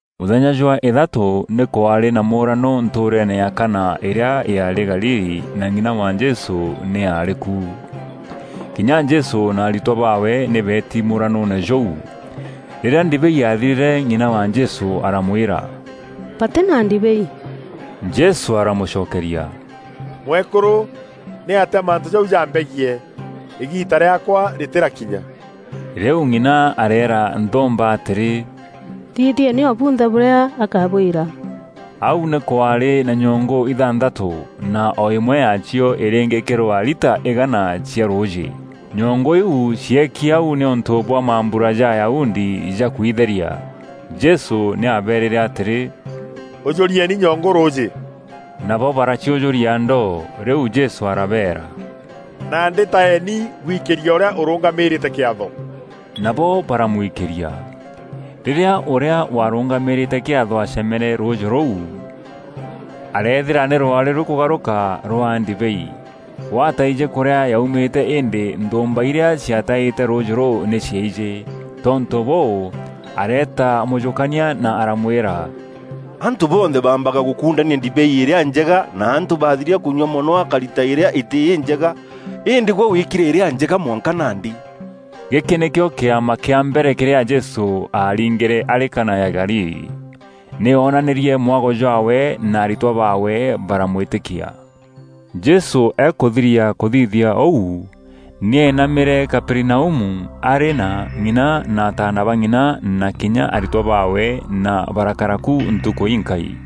Mûthenya jwa îthatû nî kwaarî na mûranû ntûûreene ya Kana, îrîa yaarî Galili na ng'ina wa Jesû nî aarî ku. Kinya Jesû na aritwa baawe nî beeti mûranûûne jûu. Rîrîa ndibei yaathirîre, ng'ina wa Jesû aramwîra, “Batî na ndibei!” Jesû aramûcokeria, “Mwekûrû, nîatîa mantû jau jambegiî? Îgiita rîaakwa rîtîrakinya.” Rîu ng'ina areera nthûûmba atîrî, “Thithieni o bunthe bûrîa akabwîra.” Au nî kwaarî na nyongû ithanthatû, na o îmwe yaacio îrîngîkîrwa lita îgaana cia rûûjî. Nyongu iu cieki au nîûntû bwa mambura ja Ayahudi ja kwitheria. Jesû nî aabeerîre atîrî, “Ûjûrieni nyongû rûûjî.” Nabo baraciûjûria ndoo. Rîu Jesû arabeera, “Nandî taeni bwikîrie ûrîa ûrûngamîrîte kîatho.” Nabo baramwikîria. Rîrîa ûrîa warûngamîrîte kîatho aacemere rûûjî rûu, areethîra nî rwaarî rûkûgarûka rwaa ndibei. We ataijî kûrîa yaumîte îndî nthûûmba irîa ciataîte rûûjî rûu nî ciaijî. Tontû bûû, areeta mûjûkania na aramwîra, “Antû bonthe baambaga gûkundania ndibei îrîa njega na antû bathiria kûnyua mono akarita îrîa îtî înjega îndî gwe wîkîre îrîa njega mwanka nandî.” Gîkî nîkîo kîama kîa mbere kîrîa Jesû aaringîre arî Kana ya Galili. Nî oonanîrie mwago jwaawe na aritwa baawe baramwîtîkia. Jesû akûthiria kûthithia ûu, nî eenamîre Kaperinaumu arî na ng'ina na ataana ba ng'ina na kinya aritwa baawe na barakara ku ntukû inkai.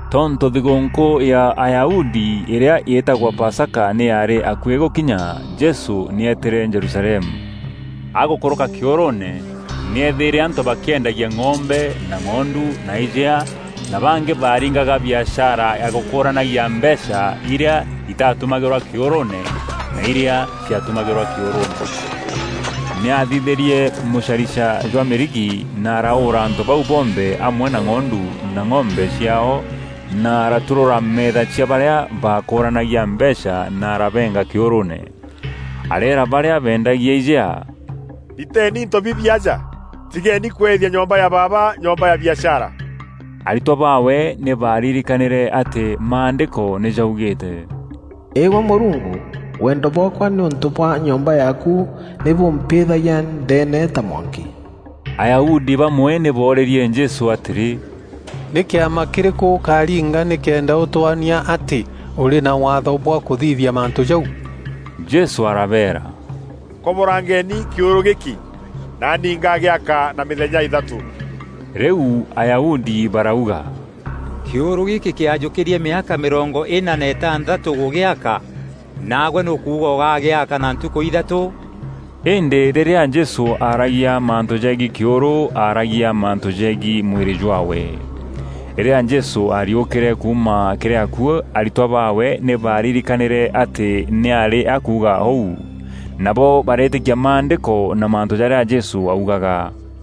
Tontû thigûûnkû ya Ayahudi îrîa îtagwa Pasaka nî yaarî akuî gûkinya, Jesû nî eetîre Jerusalemu. Agûkûrûka kîûrûûne nî eethîîre antû bakîendagia ng'ombe na ng'ondu na ijea na bangî baaringaga biashara ya gûkûranagia mbeecha irîa îtatumagîrwa kîûrûûne na irîa ciatumagîrwa kîûrûûne. Nî aathithîrie mûcarica jwa mîrigi, na araûûra antû bau bonthe amwe na ng'ondu na ng'ombe ciaao na araturûra meetha cia barîa baakûranagia mbeecha na arabeenga kîûrûûne. Areera barîa beendagia ijea, “Riteeni into bibi aja. Tigeeni kweethia nyomba ya Baaba nyomba ya biashara.” Aritwa baawe nî baaririkanîre atî Maandîko nî jaugîîte: “Îgwe Mûrungu, wendo bwaakwa nîûntû bwa nyomba yaaku nî bûmpîthagia ndeene ta mwanki.” Ayahudi bamwe nî boorîrie Jesû atîrî, “Nî kîama kîrîkû ûkaringa nîkenda ûtwonia atî ûrî na waatho bwa kûthithia mantû jau?” Jesû arabeera, “Koborangeni kîûrû gîkî, naani ngaagîaka na mîthenya îthatû.” Rîu Ayahudi barauga, “kîûrû gîkî kîajûkîrie mîaka mîrongo îna na îtantatû gûgîaaka, nagwe nî ûkuuga ûgaagîaka na ntukû îthatû?” Îndî rîrîa Jesû aaragia mantû jegiî kîûrû, aaragia mantû jegiî mwîrî jwaawe. Rîrîa Jesû aariûkîre kuuma kîrî akuû, aritwa baawe nî baaririkanîre atî nî aarî akuuga ûu. Nabo bareetîkia Maandîko na mantû jarîa Jesû augaga.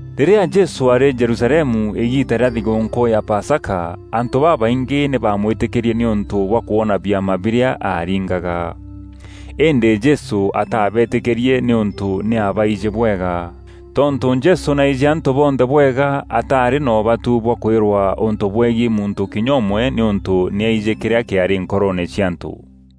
Rîrîa Jesû aarî Jerusalemu îgiita rîa thigûûnkû ya Pasaka, antû babaingî nî baamwîtîkîrie nîûntû bwa kwona biama birîa aaringaga. Îndî Jesû ataabetîkîrie nîûntû nî aabaijî bwega. Tontû Jesû nî aijî antû bonthe bwega, ataarî na ûbatu bwa kwîrwa ûntû bwegiî muntû kinya ûmwe nîûntû nî aijî kîrîa kîaarî nkoroone cia antû.